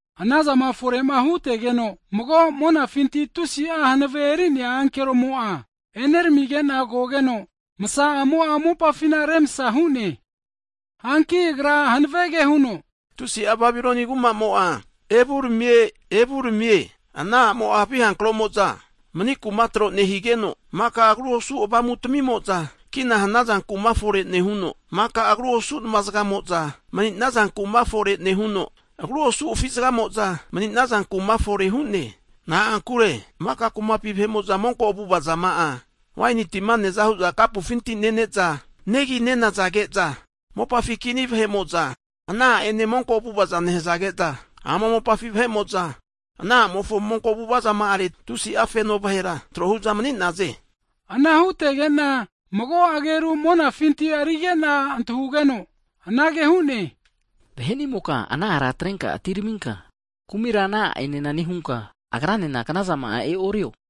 Anazama fore'ma hutegeno, mago monafinti tusi'a hanave eri'nea ankeromo'a eneramigena kogeno, msa'amo'a mopafina remsa hu'ne. Hanki agra hanavege huno, tusi'a Babiloni kumamo'a evuramie, evuramie! Ana a'mo'a havi hankromo'za mani kuma tro nehigeno, maka agru osu avamu tamimo'za kina hanaza kuma fore nehuno, maka agru osu nma zgamo'za mni'naza kuma fore nehuno, agru osu afi zgamoza mni'naza kuma fore hu'ne. Na'ankure maka kumatamimpi vahe'mo'za monko avu'avazama'a, waini tima neaza hu'za kapu'afinti nene'za, negi ne'nazage'za mopafi kini vahe'mo'za ana a'ene monko avu'avaza nehazage'za, ama mopafi vahe'mo'za, ana a'mofo monko avu'avazama'areti tusi'a feno (bisinisi) vahera tro hu'za mani'naze. Ana hutegena mago ageru monafinti arigena antahugeno, anage hu'ne, vahe'nimoka ana ara atrenka atineraminka, kumira ana a'enena nehunka agranena knazama'a e'orio.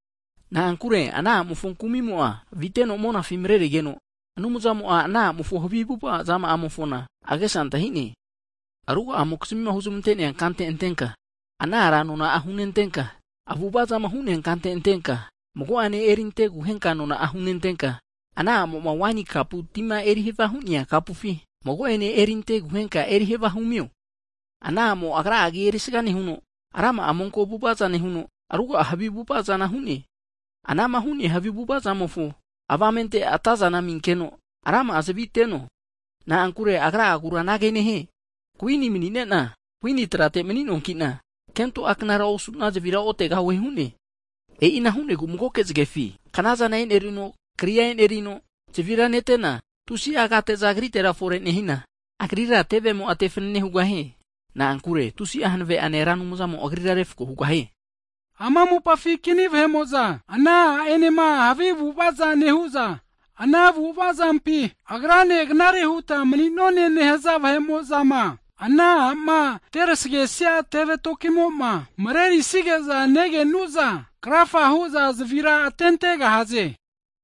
Na'ankure ana a'mofo kumimo'a, aviteno monafi mrerigeno, Anumzamo'a ana a'mofo havi avu'avazama'amofona agesa antahine. Ruga'amokizmima huzmante'nea kante antenka ana ara nona hunentenka, avu'avazama hu'nea kante antenka, mago'ene erinteguhenka nona'a hunentenka, ana a'moma waini kapu tima eri havia hu'nea kapufi mago'ane eriante aguhenka erihavia humio. Ana a'mo, agra'a agi erisaga nehuno, rama'a monko avu'avaza nehuno, ruga'a havi avu'avazana hu'ne. Anama hu'nea havi avu'avazama'amofo avamente atazana aminkeno, rama'a zavi ateno. Na'ankure agra'agura anage nehie, kuini manina, kuini trate mni'noankina, kento a' knara osuna, zavira otegahue hu'ne. E'ina hu'negu magoke zgefi, knazana enerino, kria enerino, zavira netena, tusi'a agate'za agritera fore nehina, agrira (Babilonia) tevemo'a te fanane hugahie. Na'ankure tusi'a hanave'ane Ra Anumzamo, agrira refko hu'neankino haviza hugahie. Ama mopafi kini vahe'mo'za, ana a'enema havi avu'avaza nehu'za, ana havi avu'avazampi agrane knare huta mni'none nehaza vahe'mo'zama, ana a'ma terasagesia teve tokimoma mrerisige'za negenu'za, krafa hu'za zavira atentegahaze.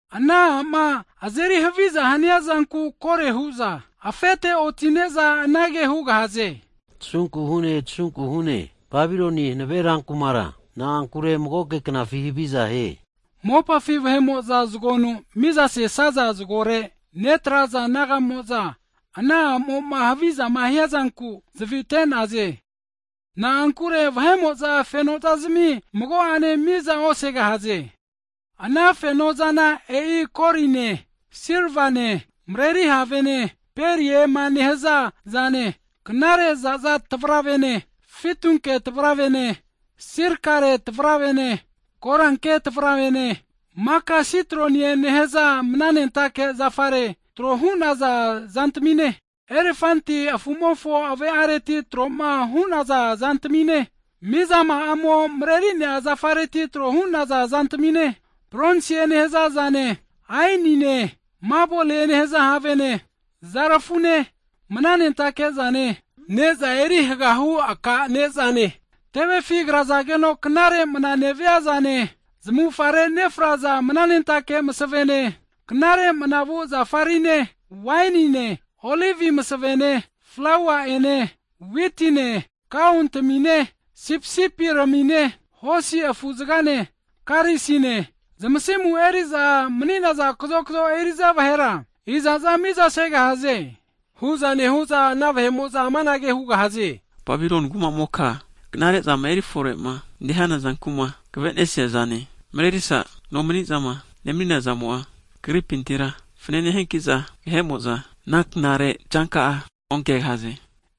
Ana a'ma azeri haviza haniazanku kore huza afete otine'za anage hugahaze, tasunku hune tasunku hune, Babiloni hanave rankumakura na'ankure magoke knafi haviza hie. Mopafi vahe'mo'za zgonu mizaseza zgore netraza nagamo'za (bisinisi) ana a'mo'ma havizama hiazanku zavite'naze. Na'ankure vahe'mo'za fenozazmi magoane miza osegahaze. Ana fenozana e'i koline, silvane, mreri havene, periema nehaza zane, knare zaza tavravene, fitunke tavravene, silkare tavravene, koranke tavravene, maka sitroni nehaza mananentake zafareti tro hu'naza zantamine, elefanti afumofo ave'areti troma (ivori) hu'naza zantamine, mizama'amo mrerinea zafareti tro hu'naza zantamine, bronsie nehazazane, aenine, mabolie nehaza havene, zarafune (sinamon), mananentake zane, neza eri hagahu aka nezane, tevefi krazageno knare mna neviazane, zmavufare nefraza mananentake masavene, knare manavu zafarine (frenkinsens), wainine, olivi masavene, flaua'ene, witine, kaontamine, sipisipiramine, hosi afuzgane, karisine, zmasimu eriza mni'naza kazokzo eriza vahera, izaza miza segahaze. Hu'za nehu'za ana vahe'mo'za amanage hugahaze, Babiloni kuma'moka knare'zama erifore'ma nehana zanku'ma kvenesiazane, mrerisa nomnizama nemaninazamo'a kagripintira fanane hiankiza, vahe'mo'za ana knare'zanka'a onkegahaze.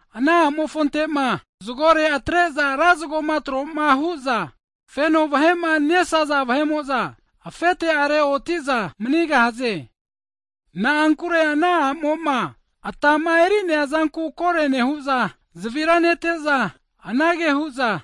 Ana a'mofontema zgore atre'za ra zgoma tro'ma huza feno vahe'ma nesaza vahe'mo'za, afete'are otiza manigahaze. Na'ankure ana a'moma atama eri'neazanku kore nehu'za zavira nete'za, anage hu'za,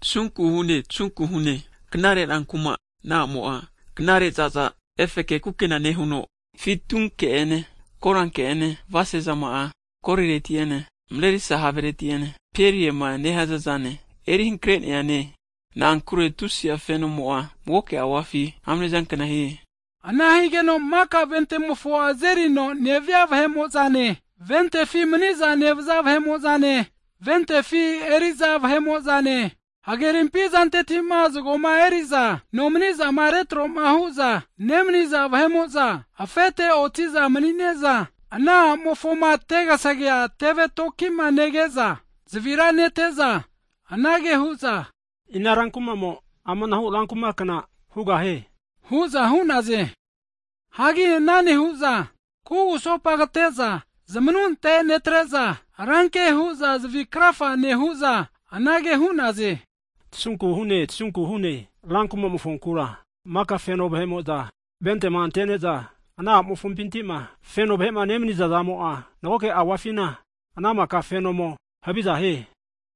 tasunku hune, tasunku hune, knare ran kuma, ana a'mo'a knare zaza efeke kukena nehuno, fitunke'ene koranke'ene, avasesezama kolireti'ene, mrerisa havereti'ene, periema (pearls) nehaza zane, eri hankre'neane, na'ankure tusi'a fenomo'a mago auafi amnezankna hie! Ana higeno maka ventemofo azerino (kepten) nevia vahe'mo'zane, ventefi maniza nevaza vahe'mo'zane, ventefi eriza vahe'mo'zane, hagerimpi zantetima zgoma eri'za nomnizama retroma hu'za nemaniza vahe'mo'za, afete oti'za mni'neza, ana a'mofoma tegasagea teve tokima nege'za, zavira nete'za anage hu'za, ina rankumamo amanahu rankumakna hugahie? hu'za hu'naze. Hagi ana nehu'za kugusopa kate'za zamanunte netreza ranke hu'za, zavi krafa, nehu'za anage hu'naze, tasunku hune tasunku hune rankumamofonkura, maka feno vahe'mo'za ventema antene'za ana a'mofompintima feno vahema nemniza zamo'a magoke auafina ana maka fenomo haviza hie.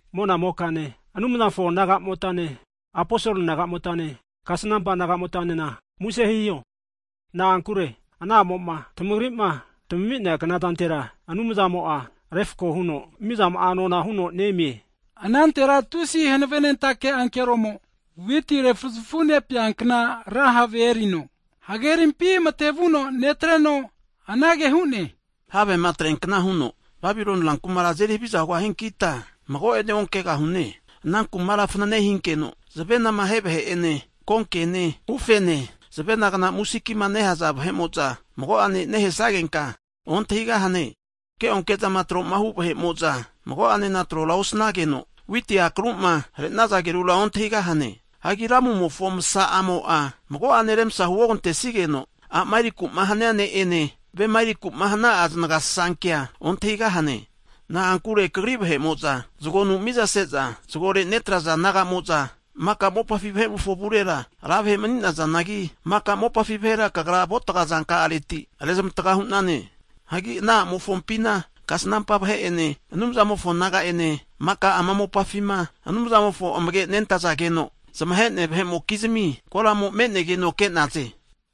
Monamokane, Anumzamofo nagamotane, aposol nagamotane, kasnampa nagamotanena muse hiho, na'ankure ana a'mo'ma tamagrima tami'nea knazantera Anumzamo'a refko huno mizama'a nona huno nemie. Anantera tusi hanavenentake ankeromo, witi refuzafu nepeankna ra have erino hagerimpi matevu netreno anage hu'ne, havema atreankna huno Babiloni rankumara azeri haviza hugahiankita, mago'ene onkegahu'ne Ana kumara fanane hinkeno, zavenama ahe vahe'ene konkene ufene, zavenagna musikima nehaza (harp) vahe'mo'za mago'ane nehesagenka ontahigahane. Keonke'zama tro'mahu vahe'mo'za mago'ane trora osanageno, witi akaruma hare'naza agerura ontahigahane. Hagi ramumofo msa'a mo mago'ane remsa huogantesigeno, a'ma eri'kuma hania ne'ene, vema erikuma hana'a zanagasasankea ontahigahane. Na'ankure kagri vahe'moza zgonu mizaseza zgore netraza nagamo'za (bisinisi) maka mopafi vahe'mofo avurera ra vahe mani'nazangi, maka mopafi vahera kagra avuatga zanka'reti rezmataga hu'nane. Hagi ana a'mofompina kasnampa vahe'ene, Anumzamofo naga'ene maka ama mopafima Anumzamofo amage nentazageno zmahe'nea vahe'mokizmi koramo me'nege'za ke'naze.